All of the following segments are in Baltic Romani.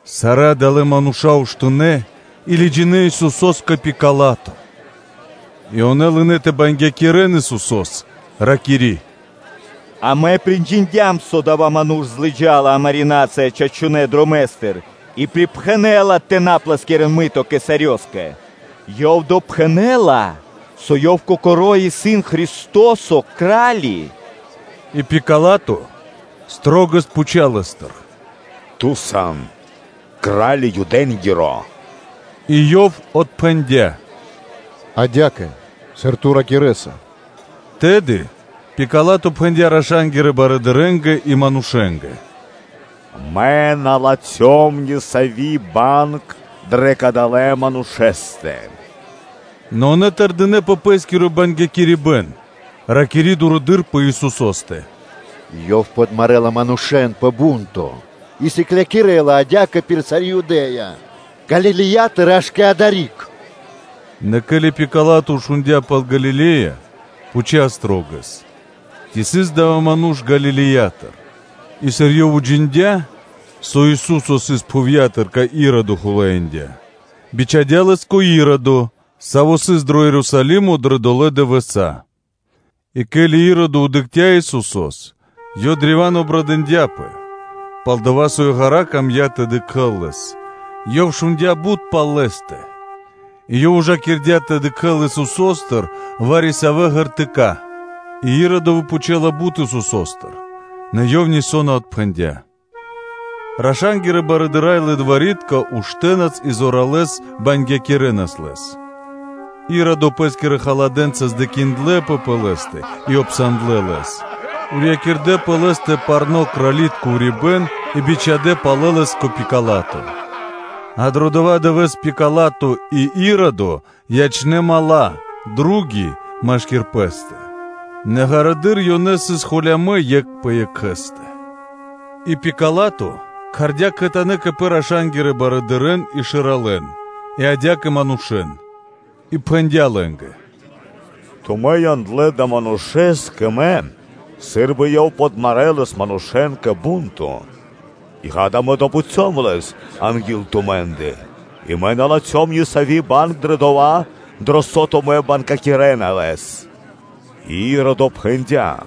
[Сарэ́ адалэ́ мануша́ уштынэ́ и лыджинэ́ Исусо́с кэ Пила́то]. И ёнэ лынэ́ тэ бангякирэн Исусо́с, ракири́: “Амэ приджиндям, со адава́ ману́ш лыджа́ла криг амари́ нацыя чачунэ́ дромэ́стыр и припхэнэла тэ на плэскирэн мыто Кесарёскэ; Ёв допхэнэ́ла, со Ёв Кокоро́ исын Христо́со Кра́ли. И Пила́то шылалэс пхуця́ Лэ́стыр: “Ту сан Кра́ли Юдэ́нгиро?” И Ёв отпхэндя́: “Адя́кэ, сыр ту ракирэ́са.” Тэды Пила́то пхэндя́ раша́нгирэ барыдырэ́нгэ и манушэ́нгэ: “Мэ на латхём ни сави́ банг дрэ кадалэ́ манушэ́стэ.” Нэ ёнэ тэрдинэ́ пэ пэ́скиро бангякирибэн, ракири́ дурэды́р пэ Исусо́стэ: “Ёв подмарэла манушэ́н пэ бу́нто и сыклякирэ́ла адя́кэ пир сари́ Юдэ́я, Галилеятыр аж кэ адари́к.” Нэ ке́ли Пила́то шундя́ пал Галиле́я, пхуця́ шылалэс, ци сыс адава́ ману́ш Галилеятыр; и сыр ёв уджиндя́, со Ису́со сыс пхувья́тыр, кай Иродо хулаиндя, бичхадя́ Лэс кэ Иродо, саво́ сыс дро Ерусалимо дрэ долэ́ дывэса́. И ке́ли Иродо дыкхця́ Исусо́с, ёв древа́н обрадындяпэ, пал-дова́ со ёв ґара́ камдя́ тэ дыкхэ́л Лэс: ёв шундя́ бут пал Лэ́стэ, и ёв ужакирдя тэ дыкхэ́л Исусо́стыр вари-савэ́ ди́вы; и Иродо выпхучэлапэ бут Исусо́стыр, нэ Ёв нисо́ на отпхэндя́. Раша́нгирэ барыдыра́ и лылвари́тка уштэнас и зоралэ́с бангякирэнас Лэс. Иродо пэ́скирэ халадэнца кэрдэ́ бипатывакирибэн Лэ́скэ и сандлэпэ холямэс Лэ́стыр, урьякирдэ пэ Лэ́стэ парно́ крали́тко урибэ́н и бичхадя́ палэ Лэс кэ Пила́то. А дро дова́ дывэ́с Пила́то и Иродо ячнэ́ дру́ги (мала́) машки́р пэ́стэ, нэ ґарэдыр ёнэ сыс холямэ́ екх пэ екхэ́стэ. И Пила́то кхардя́ кхэтанэ́ кэ пэ раша́нгирэ барыдырэ́н, и шэралэн, и адя́кэ манушэ́н, и пхэндя́ лэ́нгэ: “Тумэ́ яндлэ́ адалэ́ Манушэ́с кэ мэ сы́рбы Ёв подмарэлас манушэ́н кэ бу́нто; и, гада, мэ допхуцём Лэс анги́л тумэ́ндэ и мэ на латхём ни сави́ банг дро дова́, дро со тумэ́ бангякирэна Лэс.” И Иродо пхэндя́: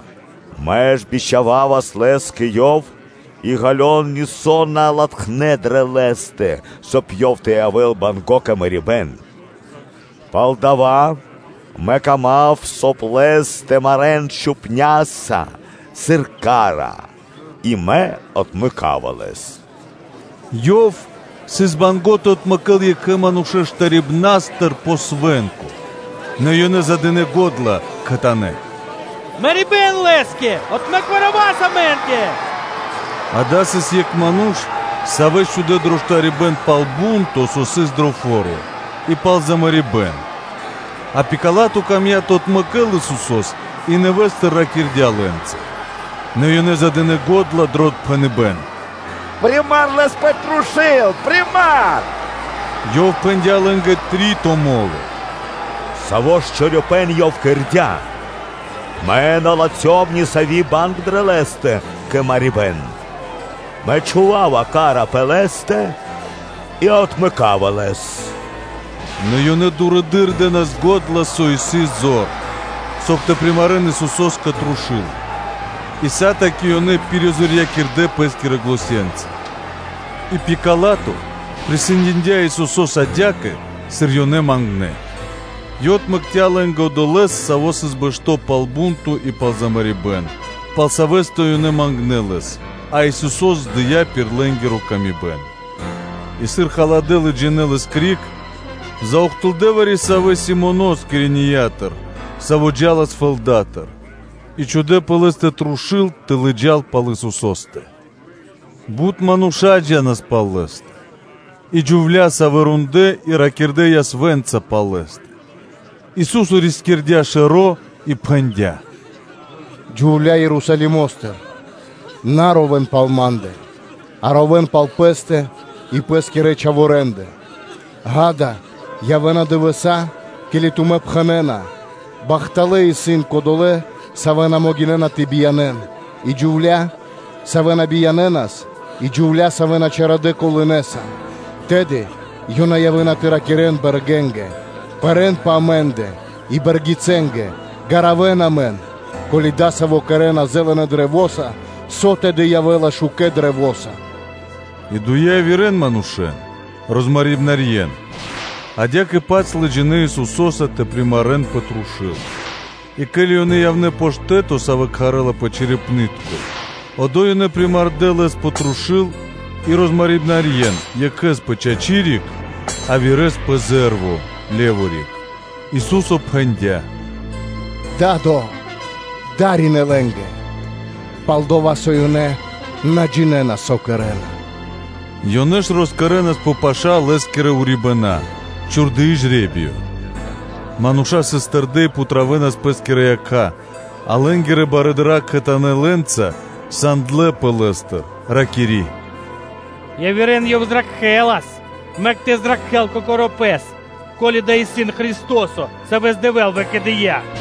“Мэ ж бичхававас Лэс кэ ёв, и, ґалён, нисо́ на латхнэ́ дрэ Лэ́стэ, соб (кай) Ёв тэ явэ́л банго́ кэ мэрибэ́н. Палдава́ мэ кама́м, соб (кай) Лэс тэ марэ́н чхупняса сыр ка́ра, и мэ отмэка́ва Лэс.” Ёв сыс банго́ тэ отмэкэ́л екхэ манушэ́с штарибнастыр пэ свэ́нко. Нэ ёнэ задынэ го́дла кхэтанэ́: “Мэрибэ́н Лэ́скэ! Отмэк Варавас амэ́нгэ!” – адава́ сыс екх ману́ш, савэ́с чхудэ́ дро штарибэ́н пал бу́нто, со сыс дро фо́ро, и пал замарибэн. А Пила́то камдя́ тэ отмэкэ́л Исусо́с и нэвэ́стыр ракирдя́ лэ́нца. Нэ ёнэ задынэ го́дла дро отпхэныбэ́н: “Примар Лэс пэ трушу́л, примар!” Ёв пхэндя́ лэ́нгэ три́то мо́ло: “Саво́ ж чорипэ́н Ёв кэрдя́? Мэ на латхём ни сави́ банг дрэ Лэ́стэ кэ мэрибэ́н: мэ чхува́ва ка́ра пэ Лэ́стэ и отмэка́ва Лэс.” Нэ ёнэ дурэды́р дэ́нас го́дла со исын зор, соб (кай) тэ примарэн Исусо́с кэ трушу́л. И сатаки ёнэ пиризорьякирдэ пэ́скирэ заненца (глосенца). И Пила́то присэндиндя Исусо́с адя́кэ, сыр ёнэ мангнэ́. Ёв отмэкця́ лэ́нгэ одолэ́с, саво́ сыс бэшто́ пал бу́нто и замарибэн, пал савэ́стэ ёнэ мангнэ́ лэс, а Исусо́с дыя́ дрэ васта́ лэ́нгэ пир выкэдыибэн. И сыр халадэ́ лыджинэ́ Лэс криг, заухтылдэ вари-савэ́ Симонос, Киренеятыр, саво́ джа́лас фэлдатыр, и чхудэ́ пэ лэ́стэ трушу́л тэ лыджа́л пал Исусо́стэ. Бут мануша́ джа́нас пал Лэ́стэ, и джувля́, савэ́ рондлэ́ и ракирдэ́ ясвэ́нца пал Лэ́стэ. Ису́со рискирдя́ шэро́ и пхэндя́: “Джувлялэ Ерусалимо́стыр! На ровэ́н пал Ма́ндэ, а ровэ́н пал пэ́стэ и пэ́скирэ чхаворэндэ; ґа́да, явэ́на дывэса́, ке́ли тумэ́ пхэнэ́на: ‘Бахталэ́ исын кодолэ́, савэ́ на могинэ́на тэ биянэн, и джувля́, савэ́ на биянэнас, и джувля́, савэ́ на чарадэ колынэса’. Тэды ёнэ явэ́на тэ ракирэ́н бэргэнгэ: ‘Пэрэн пэ амэ́ндэ’, и бэргицэнгэ: Ѓаравэн амэн;’” Ко́ли ёнэ дасаво кэрэ́на зэлэнэ каштэса, со тэды явэ́ла шукэ́ каштэса?” И дуе явирэ манушэ́н, розмарибнарьен, адя́кэ-паць лыджинэ́ Исусо́са тэ примарэн пэ трушу́л. И ке́ли ёнэ явнэ́ пэ штэ́то, саво́ кхарэлпэ “Черепнытко”, одо́й ёнэ примардэ Лэс пэ трушу́л и розмарибнарьен екхэ́с пир чачы риг, явирэ́с пир зэ́рво риг. Ису́со пхэндя́: “Да́до! Дарин (приманг) лэ́нгэ, пал-дова́ со ёнэ на джинэ́на, со кэрэ́на.” Ёнэ ж росчхувэнас пэ паша́ Лэ́скирэ урибэна́, чхурдыи жре́биё. Мануша́ сыс тэрдэ́ и путравэнас пэ́скирэ якха́. А лэ́нгирэ барыдыра́ кхэтанэ́ лэ́нца сандлэпэ Лэ́стыр, ракири́: “Явирэ́н Ёв зракхэлас; мэк тэ зракхэ́л Кокоро́ Пэс, ко́ли Ёв исын Христо́со, Савэс Дэвэ́л выкэдыя́.”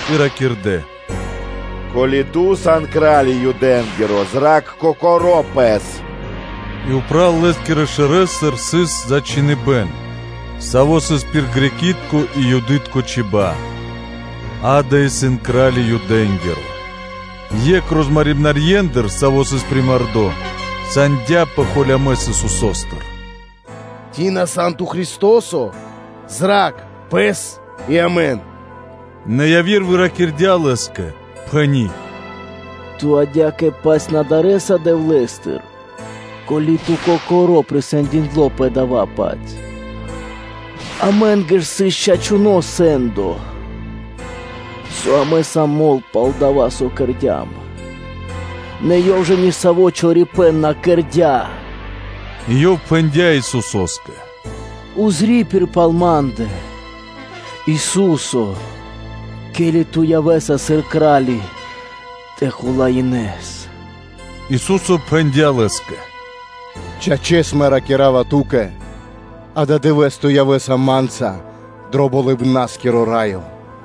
и ракирдэ́: “Ко́ли Ту сан кра́ли Юдэ́нгиро, зра́кх Кокоро́ Пэс.” И упрэ́ Лэ́скирэ шэрэстыр сыс зачхиныбэн, саво́ сыс пир греки́тко и юды́тко чиба́ (чибья́): “Ѓа́да, исын кра́ли Юдэ́нгиро.” Екх розмарибнарьендыр, саво́ сыс примардо, сандяпэ холямэс Исусо́стыр: “Ци на сан Ту Христо́со? Зра́кх Пэс и амэн.” Нэ яви́р выракирдя Лэ́скэ, пхэни́: “Ту адя́кэ-паць на дарэса Дэвлэ́стыр, ко́ли ту кокоро́ присэндиндло пэ дава́-паць? Амэ́нгэ ж сыс чачуно́ сэ́ндо, со амэ сам мол пал дова́, со кэрдя́м; нэ Ёв ж ни саво́ чорипэ́н на кэрдя́.” И ёв пхэндя́ Исусо́скэ: “Пририпир пал ма́ндэ, Ису́се, ке́ли Ту явэ́са сыр Кра́ли тэ хулаинэс?” Ису́со пхэндя́ Лэ́скэ: “Чачэс, Мэ ракира́ва ту́кэ: ададывэ́с ту явэ́са Ма́нца дро Болыбна́скиро Раё.”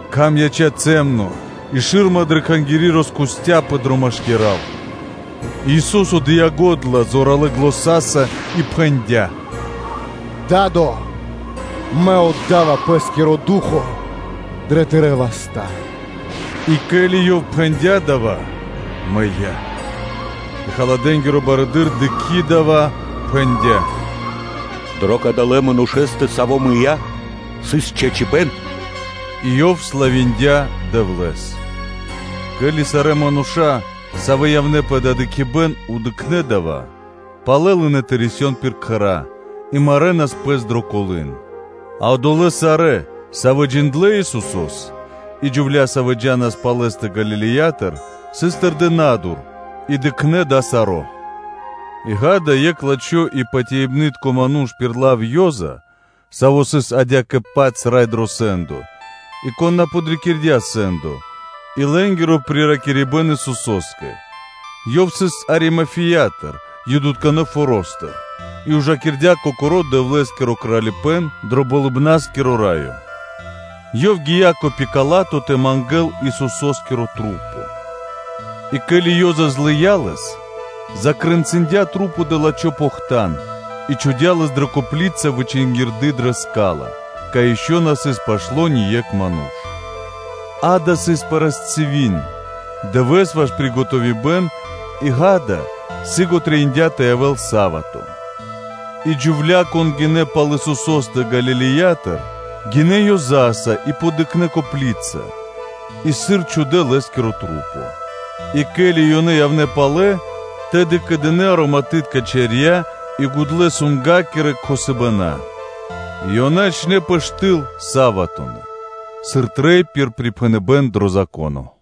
Кхам яця́ цямло и шы́рма дрэ Кхангири́ роскусцяпэ дро машкира́л. И Ису́со дыя́ го́дла зоралэ́ заня́са и пхэндя́: “Да́до! Мэ отда́ва Пэ́скиро ду́хо (фа́но) дро Тырэ́ васта́!” И ке́ли Ёв пхэндя́ дава́, мыя́. А халадэ́нгиро барыдыро́, дыкхи́ дава́, пхэндя́: “Дро кадава́ Ману́ш, со мыя́, сыс чачипэ́н”, – и ёв славиндя Дэвлэ́с. Ке́ли сарэ́ мануша́, савэ́ явнэ́ пэ дава́ дыкхибэ́н, дыкхнэ́ дава́, ёнэ палэ лынэ́ тэ рисён пир кхэра́ и марэнас пэс дро колы́н. А одолэ́ сарэ́, савэ́ джиндлэ́ Исусо́с и джувля́ сыс тэрдэ́ на́дур и, савэ́ джа́нас пал Лэ́стэ Галилеятыр и дыкхнэ́ дава́ саро́. И ґа́да, екх лачхо́ и патяибны́тко ману́ш пир лав Ёза (Иосифо), саво́ сыс адя́кэ-паць екх рай барыдырэндыр дро сэ́ндо (совето), и кон на подрикирдя сэ́ндо и лэ́нгиро приракирибэн Исусо́скэ. Ёв сыс Аримафеятыр, Юдытконэ форо́стыр и ужакирдя кокоро́ Дэвлэ́скиро Кралипэ́н дро Болыбна́скиро Раё; ёв гия́ кэ Пила́то тэ мангэ́л Исусо́скиро тру́по. И ке́ли Ёза злыя́ лэс, закрэнцындя тру́по дро жужо́ похтан и чхудя́ лэс дрэ копли́ца вычингирды дрэ ска́ла, кай ишчо (инкэ́) на сыс пашто́ ни екх ману́ш. Дава́ сыс парастиви́н (пятница), [дывэ́с ваш приготовиныбэн-ю.о.], и ґа́да, сыго трэиндя́ тэ явэ́л са́вато. И джувля́, кон гинэ́ пал Исусо́стэ Галилеятыр, гинэ́ Ёзаса и подыкхнэ копли́ца и, сыр чхудэ́ Лэ́скиро тру́по. И ке́ли ёнэ явнэ́ палэ, тэды ёнэ кэдынэ ароматытка чарья́ и гудлэ́ драба тэ кхосэн; и ёнэ ячнэ́пэ штыл саватонэ́ (суботонэ́), сыр трэй пир припхэныбэ́н дро Зако́но.